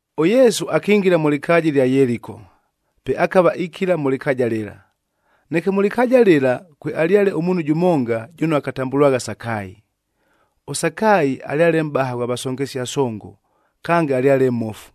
ɄYesu akingila mʉ lɨkaaja ɨlya Yeliko, pe akava ikila mʉ lɨkaaja lɨla. Neke mʉ lɨkaaja lɨla, kwealyale ʉmuunhu jʉmonga, jʉno akatambʉlwagha Sakaayi. ɄSakaayi alyale mʼbaha ghwa vasongesia songo, kange alyale mmofu.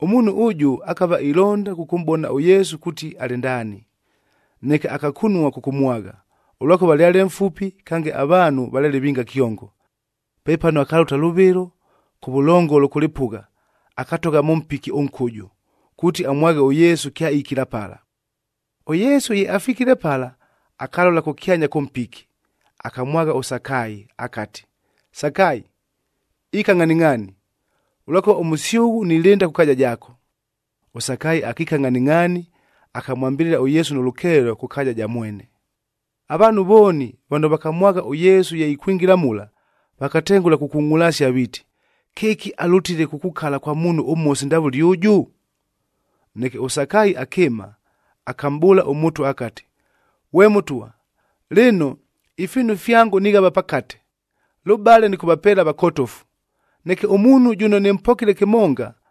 Ʉmuunhu ʉjʉ akava ilonda kʉkʉmʼbona ʉYesu kuuti alɨ ndaani, neke akakunua kʉkʉmwagha, ʉlwakʉva alyale mfupi kange avaanhu valyale vinga kyongo. Pepano akalʉta lʉvɨlo, kʉvʉlongolo kʉ lɨpʉgha, akatogha mʉ mpiki ʉnkʉjʉ, kuuti amwaghe ʉYesu kyaikila pala. ɄYesu ye afikile pala, akalola kʉkyanya kʉ mpiki, akamwagha ʉSakaayi akati, “Sakaayi, ika ngʼhaningʼhaani! Ʉlwakʉva ʉmʉsyʉghʉ nilɨnda kʉ kaaja jaako.” ɄSakaayi akiika ngʼhaningʼhaani, akamwambɨlɨla ʉYesu nʉ lʉkeelo kʉ kaaja ja mwene. Avaanhu vooni vano vakamwagha ʉYesu ye ikwingila mula, vakatengʉla kukungʼulasia viiti, “Kɨki alʉtile kukukala kwa muunhu ʉmhosi ndavʉle ʉjʉ!” Neke ʉSakaayi akɨɨma, akamʼbʉʉla ʉMʉtwa akati, “Ghwe Mʉtwa! Lɨno, ifiinu fyango nighava pakate, lʉbale nɨkʉvapeela avakotofu. Neke ʉmuunhu jʉno nɨmpokile kɨmonga,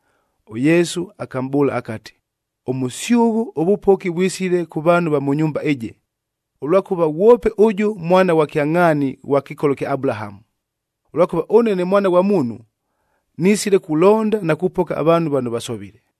ɄYesu akamʼbʉʉla akati, “Ʉmʉsyʉghʉ, ʉvʉpoki vwisile kʉ vaanhu va mʉ nyumba ɨjɨ, ʉlwakʉva ghwope ʉjʉ mwana ghwa kyangʼhaani ghwa kɨkolo kya Abulahamu. Ʉlwakʉva ʉne ne Mwana ghwa Muunhu nisile kulonda na kupoka avaanhu vano vasovile.”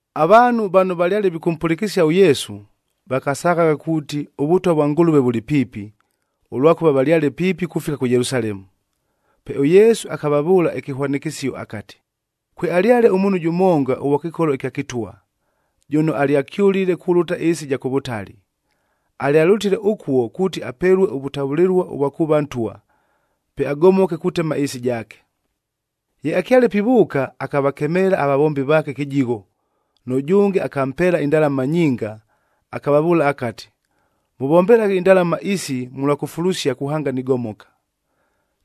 Avaanhu vano valyale vikʉmpʉlɨkɨsia ʉYesu, vakasaghagha kuuti ʉVʉtwa vwa Ngʉlʉve vʉlɨ piipi,b ʉlwakʉva valyale piipi kufika kʉ Yelusalemu. Pe ʉYesu akavavʉʉla ɨkɨhwanɨkɨsio akati, “Kwealyale ʉmuunhu jʉmonga ʉghwa kɨkolo ɨkya kɨtwa, jʉno alyakyʉlile kulʉta ɨɨsi ɨja kʉ vʉtali. Alyalʉtile ʉkuo kuuti apelue ʉvʉtavʉlɨlua ʉvwa kuuva ntwa, pe agomoke kutema ɨɨsi jaake. “Ye akyale pivʉʉka, akavakemeela avavombi vaake kɨjigho, nʉjʉnge akampeela indalama nyinga,c akavavʉʉla akati, ‘Mʉvombelaghe indalama isi mʉlwa kufulusia kuhanga nigomoka.’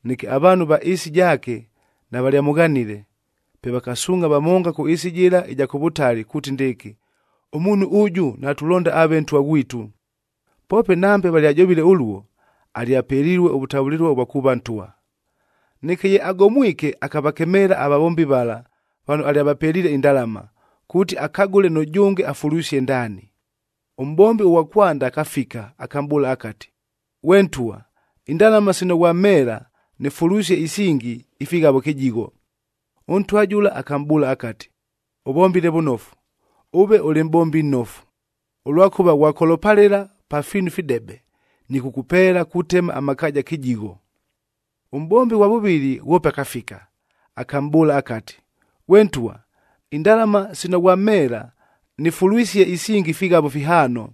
Neke avaanhu ava ɨɨsi jaake navalyamʉghanile, pe vakasuungʼha vamonga kʉ ɨɨsi jɨla ɨja kʉ vʉtali kuuti ndɨɨkɨ, ‘Ʉmuunhu ʉjʉ, natulonda aave ntwa ghwitu!’ Poope nambe valyajovile ʉluo, alyapelilue ʉvʉtavʉlɨlua ʉvwa kuuva ntwa. “Neke ye agomwike, akavakemeela avavombi vala vano alyavapeliile indalama, kuuti akagʉle nʉjʉnge afulwisie ndaani. Ʉmʼbombi ʉghwa kwanda akafika, akamʼbʉʉla akati, ‘Ghwe ntwa, indalama sino ghwamheela nɨfulwisie isingi ifighavo kɨjigho.’ Ʉntwa jʉla akamʼbʉʉla akati, ‘Ʉvombile vʉnofu, ʉve ʉlɨ mʼbombi nnofu. Ʉlwakʉva ghwakolopalɨla pa fiinu ifidebe, nɨkʉkʉpeela kutema amakaaja kɨjigho.’ Ʉmʼbombi ʉghwa vʉvɨlɨ ghwope akafika, akamʼbʉʉla akati, ‘Ghwe ntwa, indalama sino ghwamheela, nɨfulwisie isingi ifighavo fihaano.’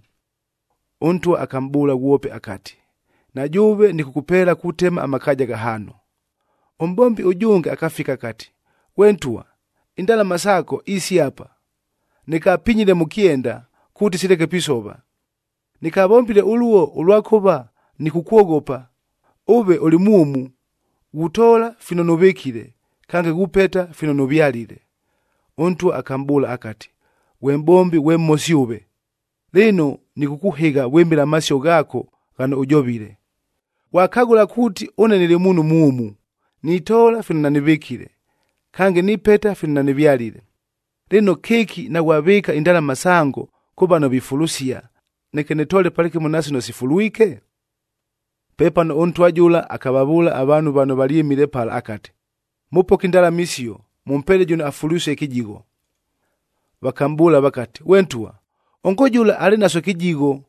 Ʉntwa akamʼbʉʉla ghwope akati, ‘Na jʉʉve, nɨkʉkʉpeela kutema amakaaja ghahaano.’ “Ʉmʼbombi ʉjʉnge akafika akati, ‘Ghwe ntwa, indalama saako isi apa. Nɨkapinyile mʉ kyenda, kuuti sileke pisova. Nɨkavombile ʉluo ʉlwakʉva nɨkʉkwoghopa, ʉve ʉlɨ mwʉmu. Ghutoola fino nʉvɨkile, kange ghupeta fino nʉvyalile.’ Ʉntwa akamʼbʉʉla akati, ‘Ghwe mʼbombi ghwe mhosi ʉve! Lɨno, nɨkʉkʉhɨgha vwɨmɨla amasio ghaako ghano ʉjovile. Ghwakagʉla kuuti ʉne nɨlɨ muunhu mwʉmu, nitoola fino nanɨvɨkile, kange nipeta fino nanɨvyalile, lɨno kɨki naghwavɨɨka indalama sango kʉ vano vifulusia,d neke nɨtoole palɨkɨmo na sino sifulwike?’ “Pepano ʉntwa jʉla akavavʉʉla avaanhu vano valyɨmile pala akati, ‘Mʉpoke indalama isio, mʉmpeele jʉno afulwisie kɨjigho.’ Vakamʼbʉʉla vakati, ‘Ghwe ntwa, ongo jʉla alɨ naso kɨjigho!’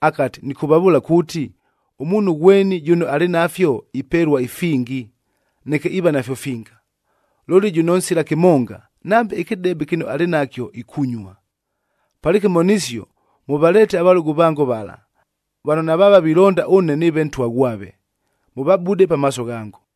Akati, ‘Nɨkʉvavʉʉla kuuti, ʉmuunhu ghweni jʉno alɨ nafyo ipelua ifingi, neke iiva nafyo finga. Looli jʉno nsila kɨmonga, nambe ɨkɨdebe kɨno alɨ nakyo, ikunyua. Palɨkɨmo nisio, mʉvaleete avalʉgʉ vango vala, vano navaava vilonda ʉne nɨɨve ntwa ghwave, mʉvabude pamaaso ghango!’”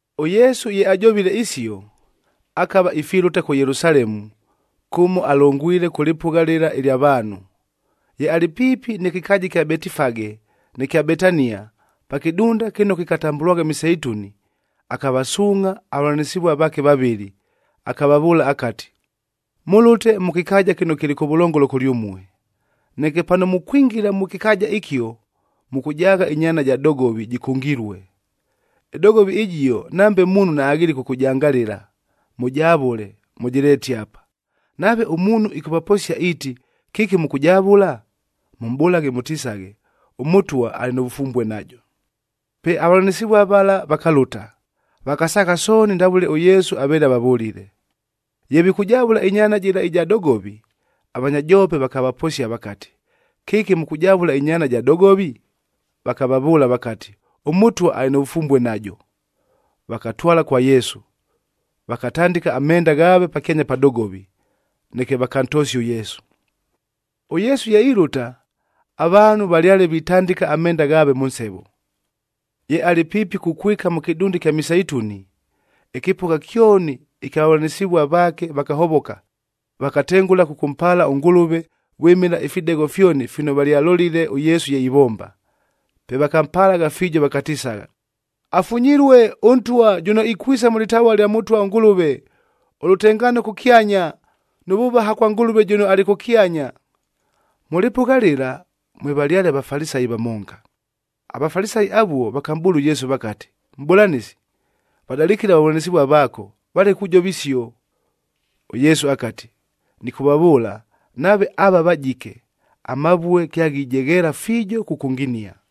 ɄYesu ye ajovile isio, akava ifilʉta kʉ Yelusalemu kʉmo alongwile kʉ lɨpʉgha lɨla ɨlya vaanhu. Ye alɨ piipi nɨ kɨkaaja ɨkya Betifage nɨ kya Betania, pa kɨdunda kɨno kɨkatambʉlwagha Miseituni, akavasuungʼha avavʉlanɨsɨvua vaake vavɨlɨ, akavavʉʉla akati, “Mʉlʉte mʉ kɨkaaja kɨno kɨlɨ kʉvʉlongolo kʉlyʉmue. Neke pano mukwingila mʉ kɨkaaja ɨkio, mʉkʉjaagha ɨnyaana ja dogovi jɨkʉngilue. Ɨdogovi ɨjio nambe muunhu naaghelile kʉkʉjangalɨla. Mʉjavʉle, mʉjɨleete apa. Nave ʉmuunhu ɨkʉvaposia iiti, ‘Kɨki mʉkʉjavʉla?’ Mʉmʼbʉlaghe mʉtisaghe, ‘ɄMʉtwa alɨ nʉ vʉfumbue najo.’” Pe avavʉlanɨsɨvua vala vakalʉta, vakasaagha sooni ndavʉle ʉYesu aveele avavʉlile. Ye vikʉjavʉla ɨnyaana jɨla ɨja dogovi, avanya joope vakavaposia vakati, “Kɨki mʉkʉjavʉla ɨnyaana ja dogovi?” Vakavavʉʉla vakati, “ɄMʉtwa alɨ nʉ vʉfumbue najo.” Vakatwala kwa Yesu, vakatandɨka amenda ghaave pakyanya pa dogovi,e neke vakantosia ʉYesu. ɄYesu ye ilʉta, avaanhu valyale vitandɨka amenda ghaave mʉ nsevo. Ye alɨ piipi kukwika mʉ kɨdunda ɨkya Miseituni, ɨkɨpʉgha kyoni ɨkya vavʉlanɨsɨvua vaakef vakahovoka, vakatengʉla kʉkʉmpaala ʉNgʉlʉve vwɨmɨla ifidegho fyoni fino valyalolile ʉYesu ye ivomba. Pe vakampalagha fiijo, vakatisagha, “Afunyilue ʉNtwa jʉno ikwisa mʉ lɨtavua lya Mʉtwa ʉNgʉlʉve.g Ʉlʉtengaano kʉkyanya nʉ vʉvaha kwa Ngʉlʉve jʉno alɨ kʉkyanya.” Mʉ lɨpʉgha lɨla mwevalyale aVafalisayi vamonga. AVafalisayi avuo vakamʼbʉʉla ʉYesu vakati, “Mʼbʉlanɨsi, vadalɨkɨle avavʉlanɨsɨvua vaako, valeke kujova isio!” ɄYesu akati, “Nɨkʉvavʉʉla, nave ava vajike, amavue kyaghijegheela fiijo kʉkʉnginia!”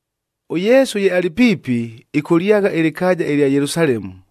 ɄYesu ye alɨ piipi, ɨkʉlyagha ɨlɨkaaja ɨlya Yelusalemu,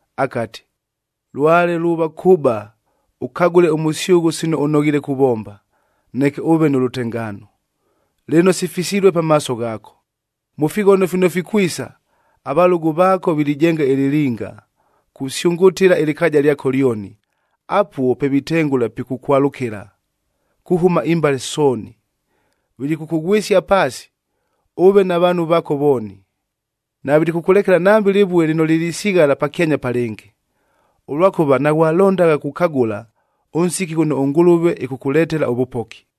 akati, “Lwale luuva kʉba ʉkagʉle ʉmʉsyʉghʉ sino ʉnoghiile kuvomba, neke ʉʉve nʉ lʉtengaano! Lɨno, sifisilue pamaaso ghaako. Mʉ fighono fino fikwisa, avalʉgʉ vaako vilijenga ɨlɨlinga, kusyʉngʉtɨla ɨlɨkaaja lyako lyoni, apuo pe vitengʉla pikʉkwalʉkɨla kuhʉma imbale sooni. Vilikʉkʉghwɨsia paasi, ʉve na vaanhu vaako vooni. Navilikʉkʉlekela nambe lɨvue lɨno lilisighala pakyanya pa lɨngɨ, ʉlwakʉva naghwalondagha kukagʉla, ʉnsiki ghʉno ʉNgʉlʉve ɨkʉkʉletela ʉvʉpoki!”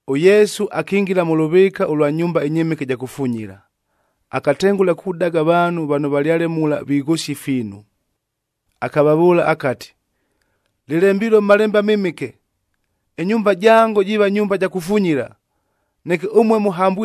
ɄYesu akingila mʉ lʉvɨɨka ʉlwa nyumba ɨnyɨmɨke ɨja kufunyila, akatengʉla kudaga avaanhu vano valyale mula vighʉsia ifiinu. Akavavʉʉla akati, “Lɨlembilue mʉ Malembe aMɨmɨke, ‘Ɨnyumba jango, jiiva nyumba ja kufunyila.’h Neke ʉmue,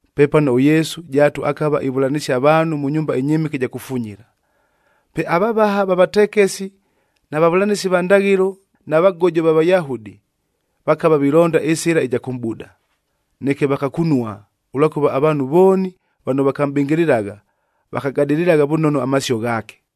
Pepano ʉYesu jaatu akava ivʉlanɨsia avaanhu mʉ nyumba ɨnyɨmɨke ɨja kufunyila. Pe avavaha va vatekesi na vavʉlanɨsi va ndaghɨlo na vagojo va Vayahudi, vakava vilonda ɨsɨla ɨja kʉmʼbuda, neke vakakunua, ʉlwakʉva avaanhu vooni vano vakamʼbɨngɨlɨlagha, vakagadɨlɨlagha vʉnono amasio ghaake.